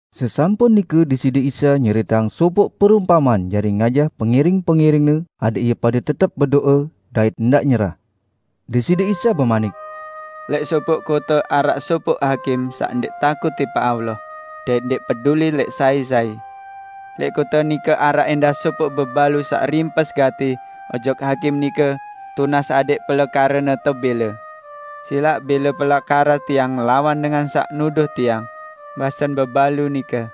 Sesampun nike Deside Isa nyeriteang sopoq perumpamean jari ngajah pengiring-pengiring-Ne adẽq ie pade tetep bedo'e dait ndaq nyerah. Deside Isa bemanik, "Lẽq sopoq kote araq sopoq hakim saq ndẽq takut tipaq Allah, dait ndẽq peduli lẽq sai-sai. Lẽq kote nike araq ẽndah sopoq bebalu saq rimpes gati ojok hakim nike tunas adẽq pelekarene tebẽle, 'Silaq bẽle pelekara tiang ngelawan dengan saq nuduh tiang,' basen bebalu nike.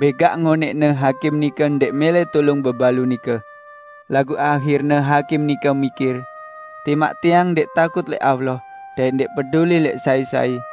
Bẽgaq ngonẽqne hakim nike ndẽq mẽlẽ tulung bebalu nike. Laguq ahirne hakim nike mikir, 'Timaq tiang ndẽq takut lẽq Allah dait ndẽq peduli lẽq sai-sai,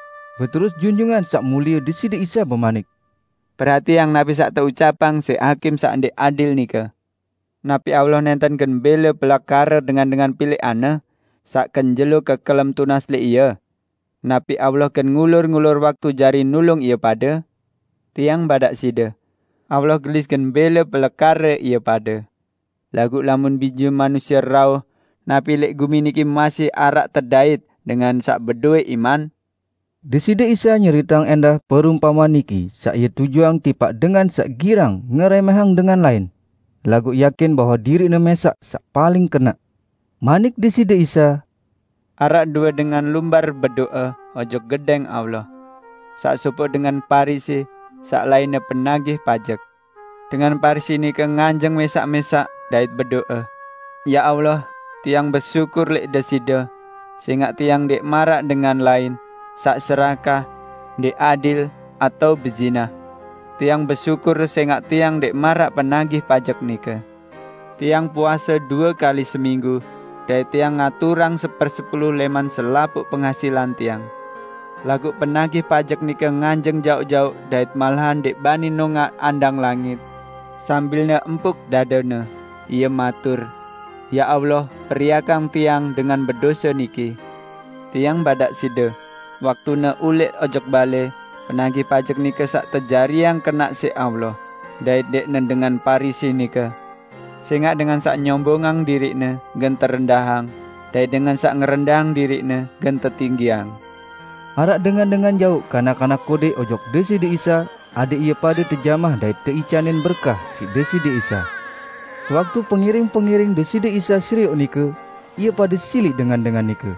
Beterus Junjungan Saq Mulie Deside Isa bemanik, "Perhatiang napi saq teucapang siq hakim saq ndẽq adil nike! Napi Allah nẽnten gen bẽle pelekare dengan-dengan pilẽqan-Ne saq kenjelo kekelem tunas lẽq Ie? Napi Allah gen ngulur-ngulur waktu jari nulung ie pade? Tiang badaq side: Allah gelis gen bẽle pelekare ie pade! Laguq lamun Bije Manusie rauh, napi lẽq gumi niki masih araq tedait dengan saq bedowẽ iman?" Deside Isa nyeriteang ẽndah perumpamean niki saq Ie tujuang tipaq dengan saq girang ngerẽmẽhang dengan lain, laguq yakin bahwe diriqne mẽsaq saq paling kenaq. Manik Deside Isa, "Araq due dengan lumbar bedo'e ojok Gedẽng Allah. Saq sopoq dengan Parisi, saq lainne penagih pajek. Dengan Parisi nike nganjeng mẽsaq-mẽsaq dait bedo'e, 'Ya Allah, tiang besyukur lẽq Deside, sẽngaq tiang ndẽq maraq dengan lain, saq serakah, ndẽq adil, atao bezinah. Tiang besyukur sẽngaq tiang ndẽq maraq penagih pajek nike. Tiang puase due kali seminggu, dait tiang ngaturang sepersepulu lẽman selapuq pengasilan tiang.' Laguq penagih pajek nike nganjeng jaoq-jaoq dait malahan ndẽq bani nongaq andang langit. Sambilne empuk dadene, ie matur, 'Ya Allah periakang tiang dengan bedose niki!' " "Tiang badaq side, waktune ulẽq ojok balẽ, penagih pajek nike saq tejariang kenaq siq Allah, dait ndẽqne dengan Parisi nike. Sẽngaq dengan saq nyombongang diriqne gen terendahang, dait dengan saq ngerendahang diriqne gen tetinggiang." Araq dengan-dengan jauq kanak-kanak kodẽq ojok Deside Isa adẽq ie pade tejamah dait teicanin berkah siq Deside Isa. Sewaktu pengiring-pengiring Deside Isa serioq nike, ie pade siliq dengan-dengan nike.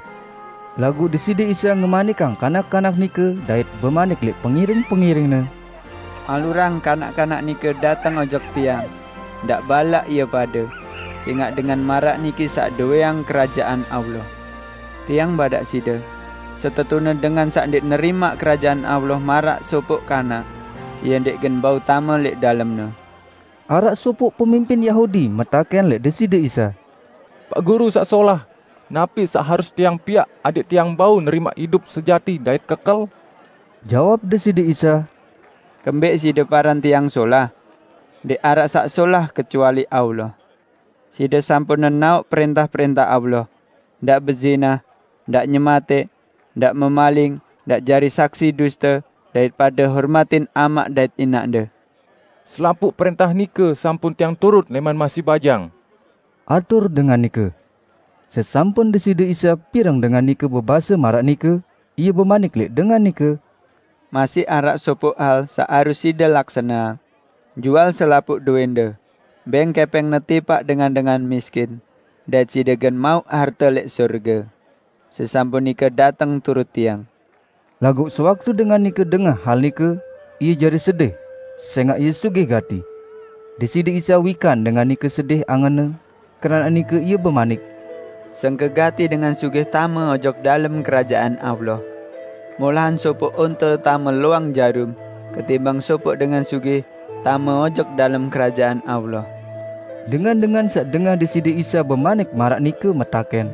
Laguq Deside Isa ngemanikang kanak-kanak nike dait bemanik lẽq pengiring-pengiring-Ne, "Alurang kanak-kanak nike dateng ojok Tiang! Ndaq balaq ie pade, sẽngaq dengan maraq niki saq dowẽang Kerajaan Allah. Tiang badaq side: Setetune dengan saq ndẽq nerimaq Kerajaan Allah maraq sopoq kanak, ie ndẽq gen bau tame lẽq dalemne." Araq sopoq pemimpin Yahudi metakẽn lẽq Deside Isa, "Paq Guru saq solah, napi saq harus tiang piaq adẽq tiang bau nerimaq idup sejati dait kekel?" Jawab Deside Isa, "Kembẽq side paran Tiang solah? Ndẽq araq saq solah kecuali Allah. Side sampun nenaoq prẽntah-prẽntah Allah: 'Ndaq bezinah, ndaq nyematẽq, ndaq memaling, ndaq jari saksi duste, dait pade hormatin amaq dait inaqde.' " "Selapuq prẽntah nike sampun tiang turut lẽman masih bajang," atur dengan nike. Sesampun Deside sa pireng dengan nike bebase maraq nike, Ie bemanik lẽq dengan nike, "Masih araq sopoq hal saq harus side laksaneang: Jual selapuq dowẽnde, bẽng kẽpẽngne tipaq dengan-dengan miskin, dait side gen mauq harte lẽq sorge. Sesampun nike dateng turut Tiang." Laguq sewaktu dengan nike dengah hal nike, ie jari sedih sẽngaq ie sugih gati. Deside Isa wikan dengan nike sedih angenne, keranaq nike Ie bemanik, "Sengke gati dengan sugih tame ojok dalem Kerajaan Allah! Molahan sopoq onte tame loang jarum, ketimbang sopoq dengan sugih tame ojok dalem Kerajaan Allah." Dengan-dengan saq dengah Deside Isa bemanik maraq nike metakẽn,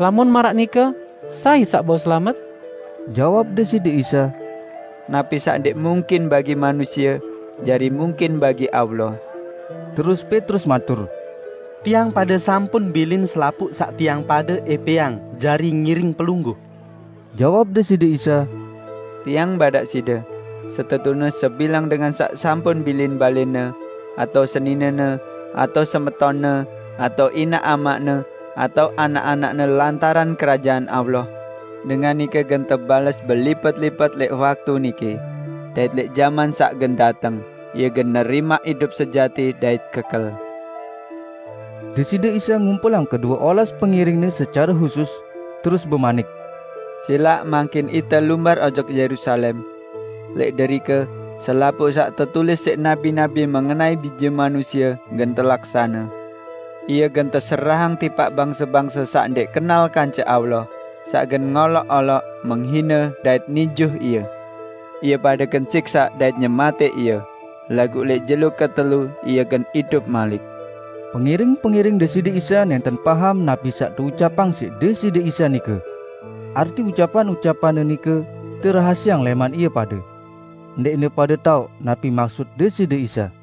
"Lamun maraq nike, sai saq bau selamet?" Jawab Deside Isa, "Napi saq ndẽq mungkin bagi manusie, jari mungkin bagi Allah!" Terus Petrus matur, "Tiang pade sampun bilin selapuq saq tiang pade ẽpẽang jari ngiring Pelungguh." Jawab Deside Isa, "Tiang badaq side, setetune sebilang dengan saq sampun bilin balẽne, atao seninene, atao semetonne, atao inaq amaqne atao anak-anakne lantaran Kerajaan Allah, dengan nike gen tebales belipet-lipet lẽq waktu niki, dait lẽq jaman saq gen dateng, ie gen nerimaq idup sejati dait kekel." Deside Isa ngumpulang kedue olas pengiring-Ne secare husus, terus bemanik, "Silaq mangkin ite lumbar ojok Yerusalem. Lẽq derike, selapuq saq tetulis siq nabi-nabi mengenai Bije Manusie gen telaksane. Ie gen teserahang tipaq bangse-bangse saq ndẽq kenal kance Allah, saq gen ngoloq-oloq, menghine, dait nijuh Ie. Ie pade gen siksaq dait nyematẽq Ie, laguq lẽq jelo ketelu, Ie gen idup malik." Pengiring-pengiring Deside Isa nẽnten paham napi saq teucapang siq Deside Isa nike. Arti ucapan-ucapan-Ne nike terahasieang lẽman ie pade. Ndẽqne pade taoq napi maksut Deside Isa.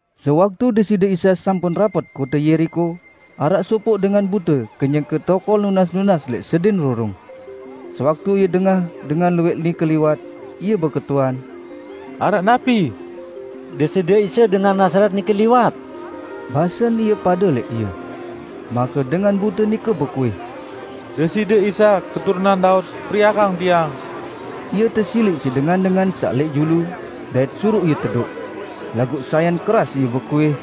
Sewaktu Deside Isa sampun rapet kote Yeriko, araq sopoq dengan bute kenyeke tokol nunas-nunas lẽq sedin rurung. Sewaktu ie dengah dengan luwẽq nike liwat, ie beketuan, "Araq napi?" "Deside Isa dengan Nazaret nike, liwat," basen ie pade lẽq ie. Make dengan bute nike bekuih, "Deside Isa, keturunan Daud! Periakang tiang!" Ie tesiliq siq dengan-dengan saq lẽq julu, dait suruq ie tedoq. Laguq sayan keras ie bekuih,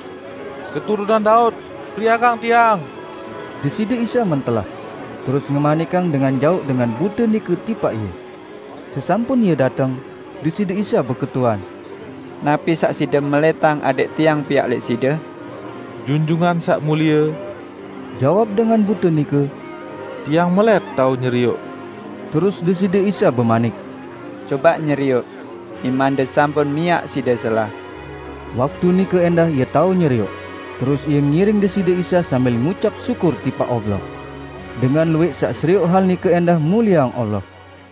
"Bije Daud! Periakang tiang!" Deside Isa mentelah, terus ngemanikang dengan jauq dengan bute nike tipaq Ie. Sesampun ie dateng, Deside Isa beketuan, "Napi saq side melẽtang adẽq Tiang piaq lẽq side?" "Junjungan Saq Mulie," jawab dengan bute nike, "tiang melẽt tao nyerioq." Terus Deside Isa bemanik, "Cobaq nyerioq! Imande sampun miaq side selah." Waktu nike ẽndah ie tao nyerioq, terus ie ngiring Deside Isa sambil ngucap syukur tipaq Allah. Dengan luwẽq saq serioq hal nike ẽndah mulieang Allah.